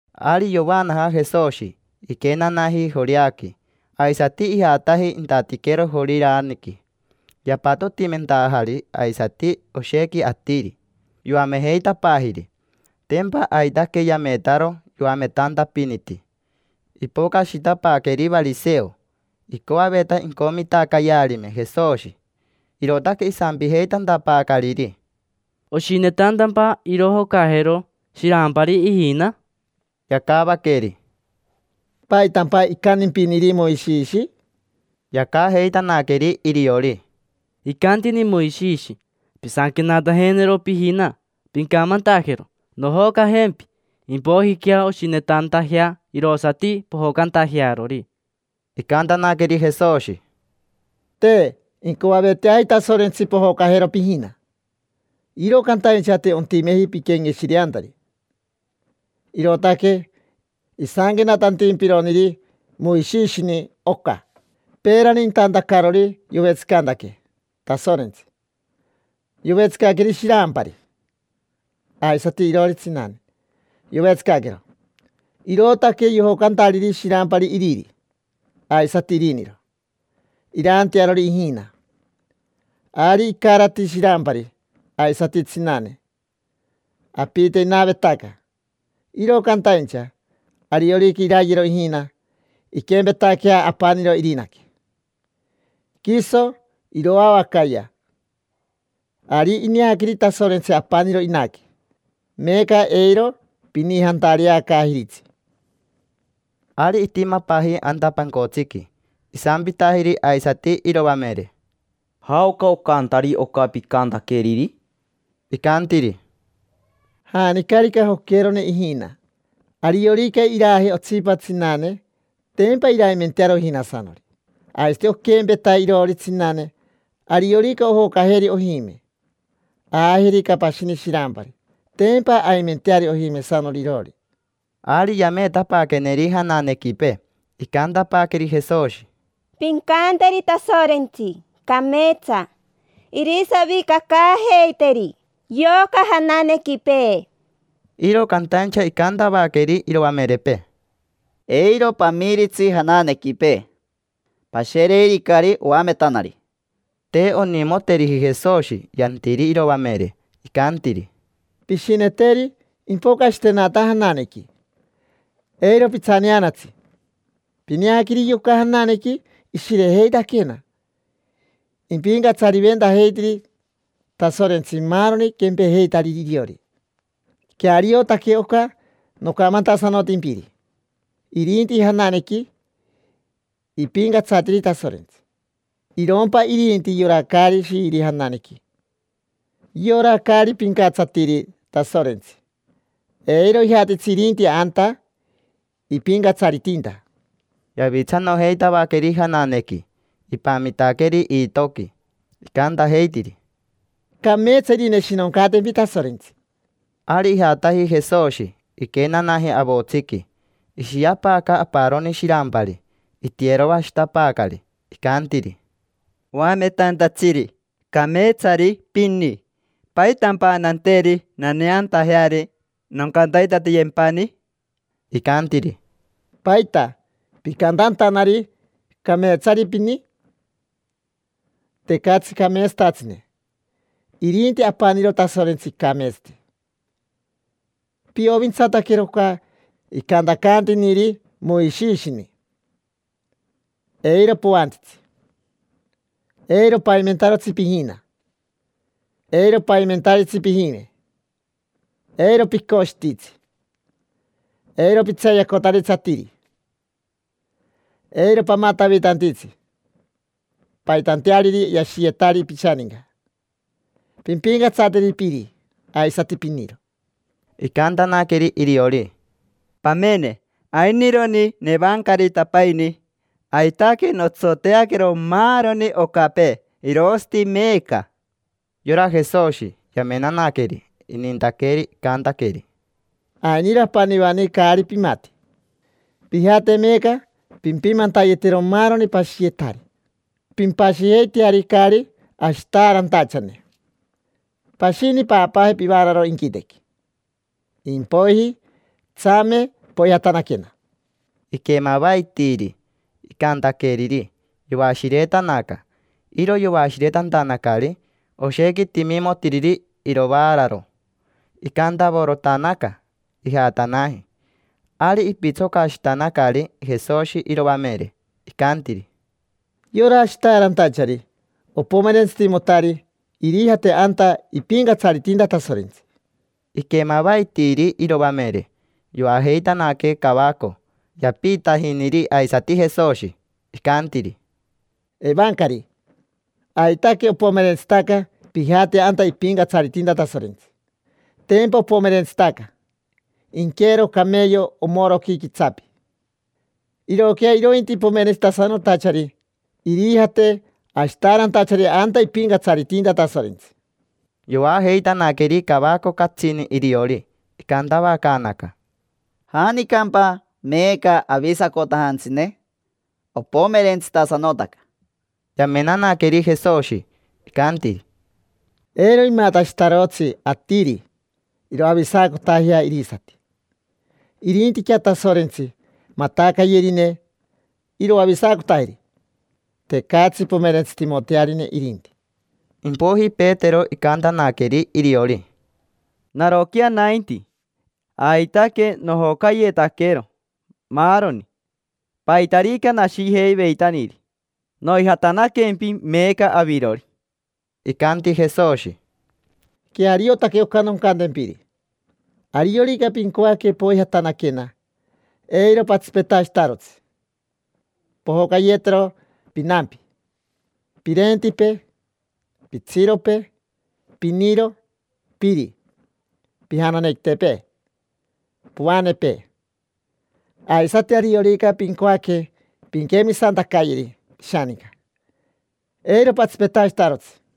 Ari yovaanaja Jesoshi, iquenanaji Joreaqui. Aisati ijataji intatiquero Joriraniqui. Yapatotimentajari aisati oshequi atiri, yoamejeitapaajiri. Tempa aitaque yametaro yoametantapiniti. Ipocashitapaaqueri variseo. Icoaveta incomitacayearime Jesoshi, irootaque isampijeitantapaacariri: —¿Oshinetantampa irojocajero shirampari ijina? Yacavaqueri: —¿Paitampa icantimpiniri Moishishi? Yacajeitanaqueri iriori: —Icantini Moishishi: “Pisanquenatajenero pijina, pincamantajero: ‘Nojocajempi’. Impoijiquea oshinetantajea irosati pojocantajearori”. Icantanaqueri Jesoshi: —Te incoaveteaji Tasorentsi pojocajero pijina, iro cantaincha te ontimeji piquenqueshireantari, irootaque isanquenatantimpironiri Moishishini oca. Peerani intantacarori yovetsicantaque Tasorentsi, yovetsicaqueri shirampari. Aisati iroori tsinane yovetsicaquero. Irootaque yojocantariri shirampari iriri, aisati iriniro, irantearori ijina. Ari icarati shirampari, aisati tsinane: apite inavetaca. Iro cantaincha, ariorica irayero ijina, inquempetaquea apaniro irinaque: quiso iroavacaya. Ari ineaqueri Tasorentsi apaniro inaque, meeca eiro pinijantareacaajiritsi. Ari itimapaaji anta pancotsiqui. Isampitajiri aisati iroamere: —¿Jaoca ocantari oca picantaqueriri? Icantiri: —Janicarica joquerone ijina, ariorica iraaje otsipa tsinane, tempa iraimentearo ijinasanori. Aisati oquempeta iroori tsinane, ariorica ojocajeri ojime, aajerica pashini shirampari, tempa aimenteari ojimesanori iroori. Ari yameetapaaqueneri jananequipee, icantapaaqueri Jesoshi: —Pincanteri Tasorentsi cameetsa irisavicacaajeiteri yoca jananequipee. Iro cantaincha icantavaqueri iroamerepee: —Eiro pamiritsi jananequipee, pashereiricari oametanari. Te onimoteriji Jesoshi yantiri iroamere. Icantiri: —Pishineteri impocashitenata jananequi. Eiro pitsaneanatsi. Pineaqueri yoca jananequi, ishirejeitaquena: ipincatsariventajeitiri Tasorentsi maaroni quempejeitariri iriori. Queariotaque oca nocamantasanotimpiri, irinti jananequi ipincatsatiri Tasorentsi. Irompa irinti yora caari shiiri jananequi, yora caari pincatsatiri Tasorentsi, eiro ijatitsi irinti anta ipincatsaritinta. Yavitsanojeitavaqueri jananequi, ipamitaqueri iitoqui. Icantajeitiri: —Cameetsa irineshinoncatempi Tasorentsi. Ari ijataji Jesoshi, iquenanaji avotsiqui. Ishiapaaca aparoni shirampari, itiyeroashitapaacari. Icantiri: —Oametantatsiri, cameetsari pini. ¿Paitampa nanteri naneantajeari, noncantaitatiyempani? Icantiri: —¿Paita picantantanari: “Cameetsari pini”? Tecatsi cameetsatatsine, irinti apaniro Tasorentsi icameetsati. Piovintsataquero oca icantacantiniri Moishishini: “Eiro poantitsi. Eiro paimentarotsi pijina. Eiro paimentaritsi pijime. Eiro picoshititsi. Eiro pitseeyacotaritsi atiri. Eiro pamatavitantitsi paitanteariri yashiyetari pishaninca. Pimpincatsateri piri, aisati piniro”. Icantanaqueri iriori: —Pamene, ainironi nevancaritapaini, aitaque notsoteaquero maaroni ocapee, irosati meeca. Yora Jesoshi, yamenanaqueri, inintaqueri. Icantaqueri: —Ainiro apanivani caari pimati. Pijate meeca pimpimantayetero maaroni pashiyetari. Pimpashijeiteari caari ashitaarantachane, pashini paapaaje pivaararo inquitequi. Impoiji, tsame, poijatanaquena. Iquemavaitiiri icantaqueriri, yoashiretanaca. Iro yoashiretantanacari oshequi timimotiriri irovaararo. Icantavorotanaca, ijatanaji. Ari ipitsocashitanacari Jesoshi iroamere, icantiri: —Yora ashitaarantachari opomerentsitimotari irijate anta ipincatsaritinta Tasorentsi. Iquemavaitiiri iroamere, yoajeitanaque cavaco. Yapiitajiniri aisati Jesoshi, icantiri: —Evancari, aitaque opomerentsitaca pijate anta ipincatsaritinta Tasorentsi. Tempa opomerentsitaca inqueero cameyo omoroqui quitsapi. Iroquea irointi pomerentsitasanotachari irijate ashitaarantachari anta ipincatsaritinta Tasorentsi. Yoajeitanaqueri cavaco catsini iriori. Icantavacaanaca: —¿Janicampa meeca avisacotajantsine? Opomerentsitasanotaca. Yamenanaqueri Jesoshi, icanti: —Eiro imatashitarotsi atiri iroavisacotajea irisati, irintiquea Tasorentsi matacayerine iroavisacotajeri. Tecatsi pomerentsitimotearine irinti. Impoiji Petero icantanaqueri iriori: —Naroquea nainti, aitaque nojocayetaquero maaroni, paitarica nashijeiveitaniri, noijatanaquempi meeca avirori. Icanti Jesoshi: —Queariotaque oca noncantempiri. Ariorica pincoaque poijatanaquena, eiro patsipetashitarotsi pojocayetero pinampi, pirentipee, pitsiropee, piniro, piri, pijananequitepee, poanepee. Aisati ariorica pincoaque pinquemisantacayeri pishaninca, eiro patsipetashitarotsi.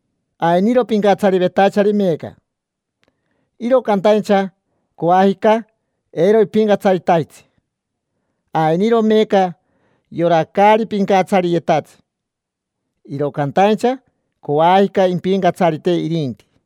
Ainiro pincatsarivetachari meeca, iro cantaincha coajica eiro ipincatsaritajitsi; ainiro meeca yora caari pincatsariyetatsi, iro cantaincha coajica impincatsarite irinti.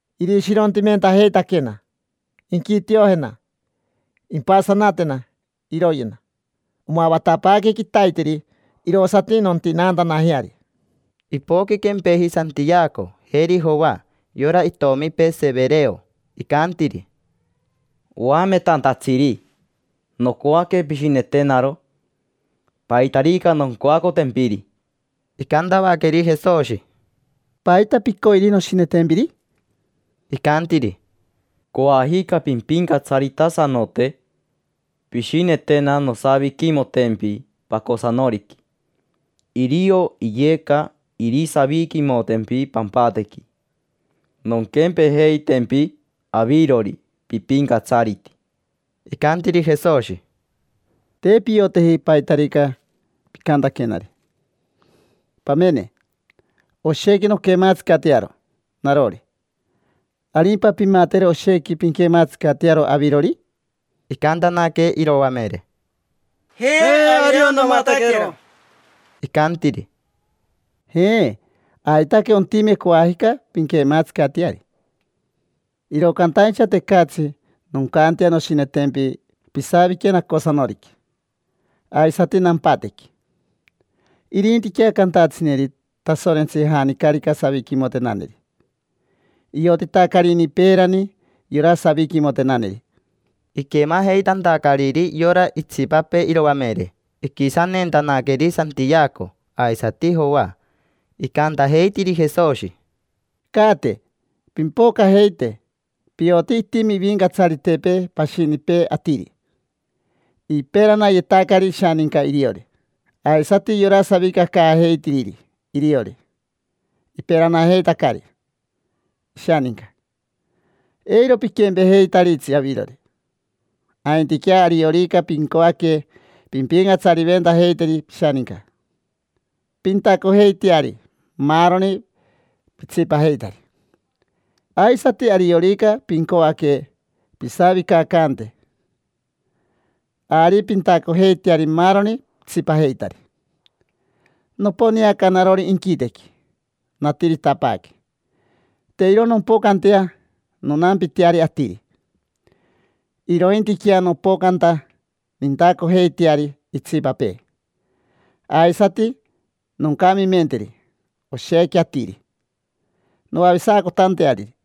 Irishirontimentajeitaquena, inquitiojena, impasanatena, iroyena. Omavatapaaque quitaiteri, irosati nontinaantanajeari. Ipoqui quempeji Santiaco, jeri Joa, yora itomipee Severeo. Icantiri: —Oametantatsiri. Nocoaque pishinetenaro paitarica noncoacotempiri. Icantavaqueri Jesoshi: —¿Paita picoiri noshinetempiri? Icantiri: —Coajica pimpincatsaritasanote, pishinetena nosaviquimotempi pacosanoriqui. Irio iyeca irisaviquimotempi pampatequi, nonquempejeitempi avirori pipincatsariti. Icantiri Jesoshi: —Te pioteji paitarica picantaquenari. Pamene, oshequi nonquematsicatearo narori, ¿arimpa pimatero oshequi pinquematsicatearo avirori? Icantanaque iroamere: —Je, ario nomataquero. Icantiri: —Je, aitaque ontime coajica pinquematsicateari. Iro cantaincha tecatsi noncantea noshinetempi pisavique nacosanoriqui, aisati nampatequi. Irintiquea cantatsineri Tasorentsi janicarica saviquimotenaneri: iotitacarini peerani yora saviquimotenaneri. Iquemajeitantacariri yora itsipapee iroamere, iquisanentanaqueri Santiaco aisati Joa. Icantajeitiri Jesoshi: —Caate, pimpocajeite. Pioti itimi ivincatsaritepee pashinipee atiri. Iperanayetacari ishaninca iriori. Aisati yora savicacaajeitiriri iriori, iperanajeitacari ishaninca. Eiro piquempejeitaritsi avirori. Aintiquea ariorica pincoaque pimpincatsariventajeiteri pishaninca, pintacojeiteari maaroni pitsipajeitari. Aisati ariorica pincoaque pisavicacante, ari pintacojeiteari maaroni pitsipajeitari. Noponeaca narori inquitequi, natiritapaaque. Te iro nompocantea nonampiteari atiri, irointiquea nopocanta nintacojeiteari itsipapee. Aisati noncamimenteri oshequi atiri, noavisacotanteariri.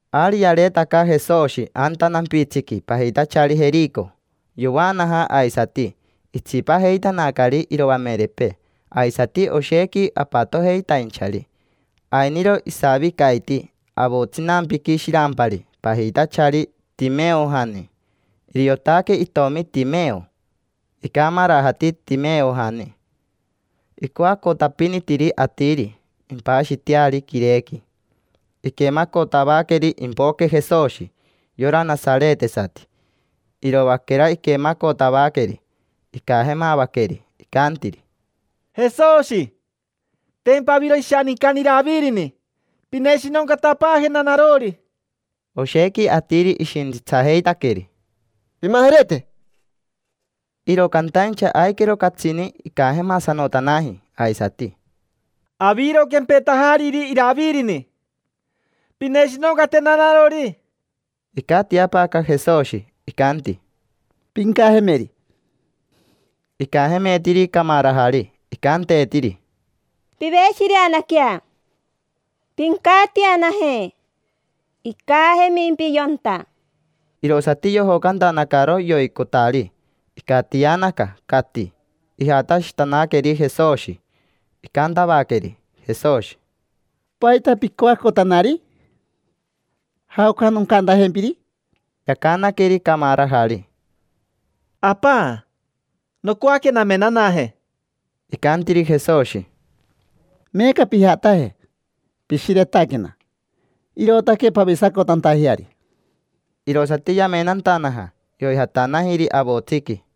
Ari yareetaca Jesoshi anta nampitsiqui pajitachari Jerico. Yovaanaja aisati, itsipajeitanacari iroamerepee aisati oshequi apatojeitainchari. Ainiro isavicaiti avotsinampiqui shirampari pajitachari Timeojani, iriotaque itomi Timeo. Icamarajati Timeojani, icoacotapinitiri atiri impashiteari quirequi. Iquemacotavaqueri impoque Jesoshi, yora nasaretesati. Iroaquera iquemacotavaqueri, icajemavaqueri, icantiri: —Jesoshi, tempa aviro ishanincani Iravirini, pineshinoncatapaajena narori. Oshequi atiri ishintsitsajeitaqueri: —Pimajerete. Iro cantaincha aiquero catsini icajemasanotanaji aisati: —Aviro quempetajariri Iravirini. Pineshinoncatena narori. Icatiapaaca Jesoshi, icanti: —Pincajemeri. Icajemeetiri camarajari, icanteetiri: —Piveshireanaquea, pincatianaje. Icajemimpi yonta. Irosati yojocantanacaro yoicotari, icatianaca, cati. Ijatashitanaqueri Jesoshi. Icantavaqueri Jesoshi: —¿Paita picoacotanari? ¿Jaoca noncantajempiri? Yacanaqueri camarajari: —Apa, nocoaque namenaje. Icantiri Jesoshi: —Meeca pijataje. Pishiretaquena, irootaque pavisacotantajeari. Irosati yamenantanaja, yoijatanajiri avotsiqui.